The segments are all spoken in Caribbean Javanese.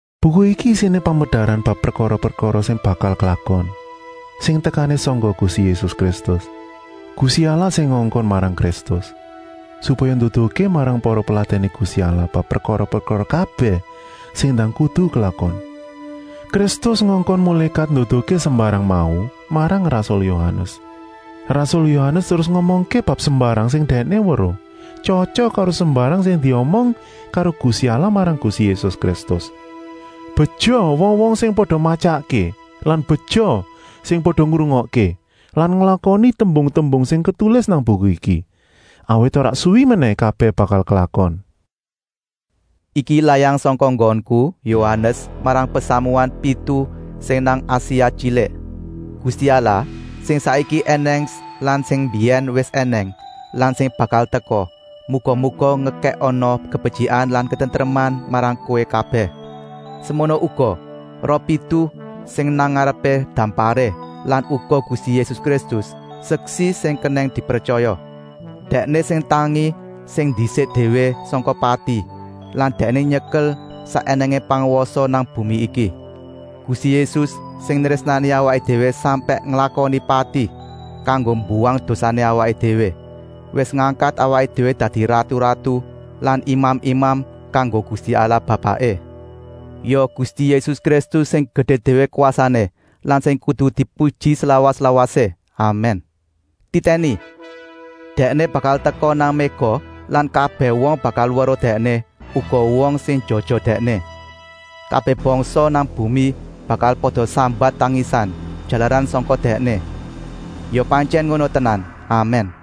Buku iki isiné pamedaran bab prekara-prekara sing bakal klakon, sing tekané sangka Gusti Yésus Kristus. Gusti Allah sing ngongkon marang Kristus, supaya nduduhké marang para peladèné Gusti Allah bab prekara-prekara kabèh sing ndang kudu klakon. Kristus ngongkon mulékat nduduhké sembarang mau marang rasul Yohanes. Rasul Yohanes terus ngomongké bab sembarang sing dèkné weruh, tyotyok karo sembarang sing diomong karo Gusti Allah marang Gusti Yésus Kristus. Beja wong-wong sing pada matyakké lan beja sing pada ngrungokké lan nglakoni tembung-tembung sing ketulis nang buku iki, awit ora suwi menèh kabèh bakal klakon. Iki layang sangka nggonku, Yohanes, marang pasamuan pitu sing nang Asia Tyilik. Gusti Allah, sing saiki ènèng lan sing mbiyèn wis ènèng lan sing bakal teka, muga-muga ngekèkana kabetyikan lan katentreman marang kowé kabèh. Semono uga roh pitu sing nang ngarepé damparé lan uga Gusti Yésus Kristus, Seksi sing kenèng dipretyaya. Dèkné sing tangi sing ndisik déwé sangka pati lan Dèkné nyekel sak ènèngé pangwasa nang bumi iki. Gusti Yésus, sing nrésnani awaké déwé sampèk nglakoni pati kanggo mbuwang dosané awaké déwé, wis ngangkat awaké déwé dadi ratu-ratu lan imam-imam kanggo Gusti Allah Bapaké. Ya Gusti Yésus Kristus sing gedé déwé kwasané lan sing kudu dipuji slawas-lawasé. Amèn. Titèni! Dèkné bakal teka nang méga lan kabèh wong bakal weruh Dèkné, uga wong sing njojoh Dèkné. Kabèh bangsa nang bumi bakal pada sambat tangisan, jalaran sangka Dèkné. Ya pantyèn ngono tenan. Amèn!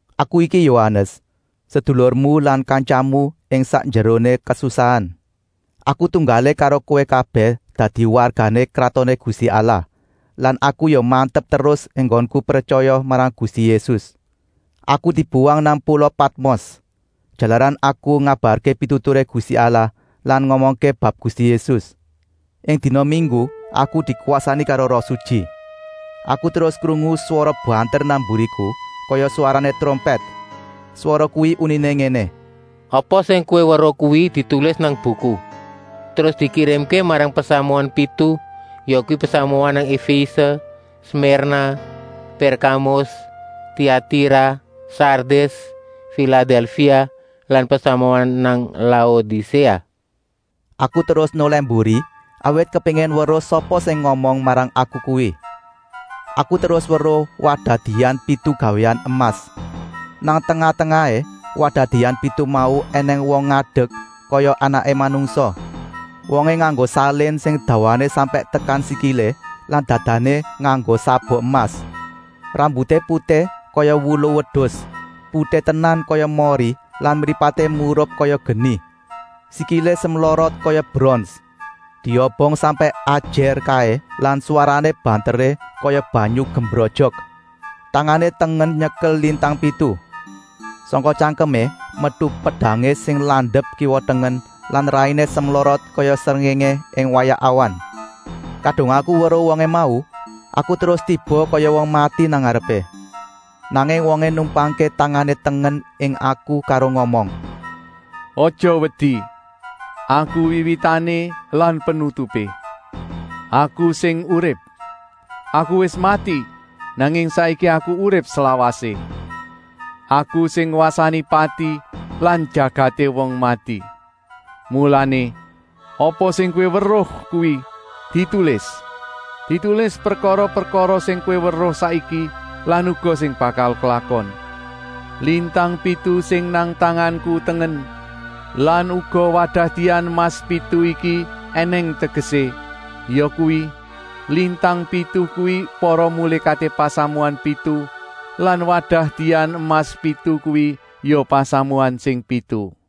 Aku iki Yohanes, sedulurmu lan kantyamu ing sakjeroné kasusahan. Aku tunggalé karo kowé kabèh dadi wargané Kratoné Gusti Allah lan aku ya mantep terus enggonku pretyaya marang Gusti Yésus. Aku dibuwang nang pula Patmos, jalaran aku ngabarké pituturé Gusti Allah lan ngomongké bab Gusti Yésus. Ing dina minggu aku dikwasani karo Roh Sutyi. Aku terus krungu swara banter nang mburiku, kaya swarané trompèt. Swara kuwi uniné ngéné: “Apa sing kowé weruh kuwi ditulis nang buku, terus dikirimké marang pasamuan pitu, yakuwi pasamuan nang Efése, Smirna, Pèrkamus, Tiatira, Sardis, Filadèlfia lan pasamuan nang Laodiséa.” Aku terus nolèh mburi, awit kepéngin weruh sapa sing ngomong marang aku kuwi. Aku terus weruh wadah dian pitu gawéan emas. Nang tengah-tengahé wadah dian pitu mau ènèng wong ngadek, kaya anaké manungsa. Wongé nganggo salin sing dawané sampèk tekan sikilé lan dadané nganggo sabuk emas. Rambuté putih kaya wulu wedus, putih tenan kaya mori lan mripaté murup kaya geni. Sikilé semlorot kaya brons diobong sampèk ajèr kaé lan swarané banteré kaya banyu gumrojok. Tangané tengen nyekel lintang pitu. Sangka tyangkemé metu pedangé sing landep kiwa-tengen lan rainé semlorot kaya srengéngé ing wayah awan. Kadung aku weruh wongé mau, aku terus tiba kaya wong mati nang ngarepé. Nanging wongé numpangké tangané tengen ing aku karo ngomong: “Aja wedi! Aku Wiwitané lan Penutupé. Aku sing urip. Aku wis mati, nanging saiki Aku urip slawasé. Aku sing ngwasani pati lan jagaté wong mati. Mulané, apa sing kowé weruh kuwi ditulis. Ditulis prekara-prekara sing kowé weruh saiki lan uga sing bakal klakon. Lintang pitu sing nang tanganku tengen lan uga wadah dian emas pitu iki ènèng tegesé, yakuwi: lintang pitu kuwi para mulékaté pasamuan pitu lan wadah dian emas pitu kuwi ya pasamuan sing pitu.”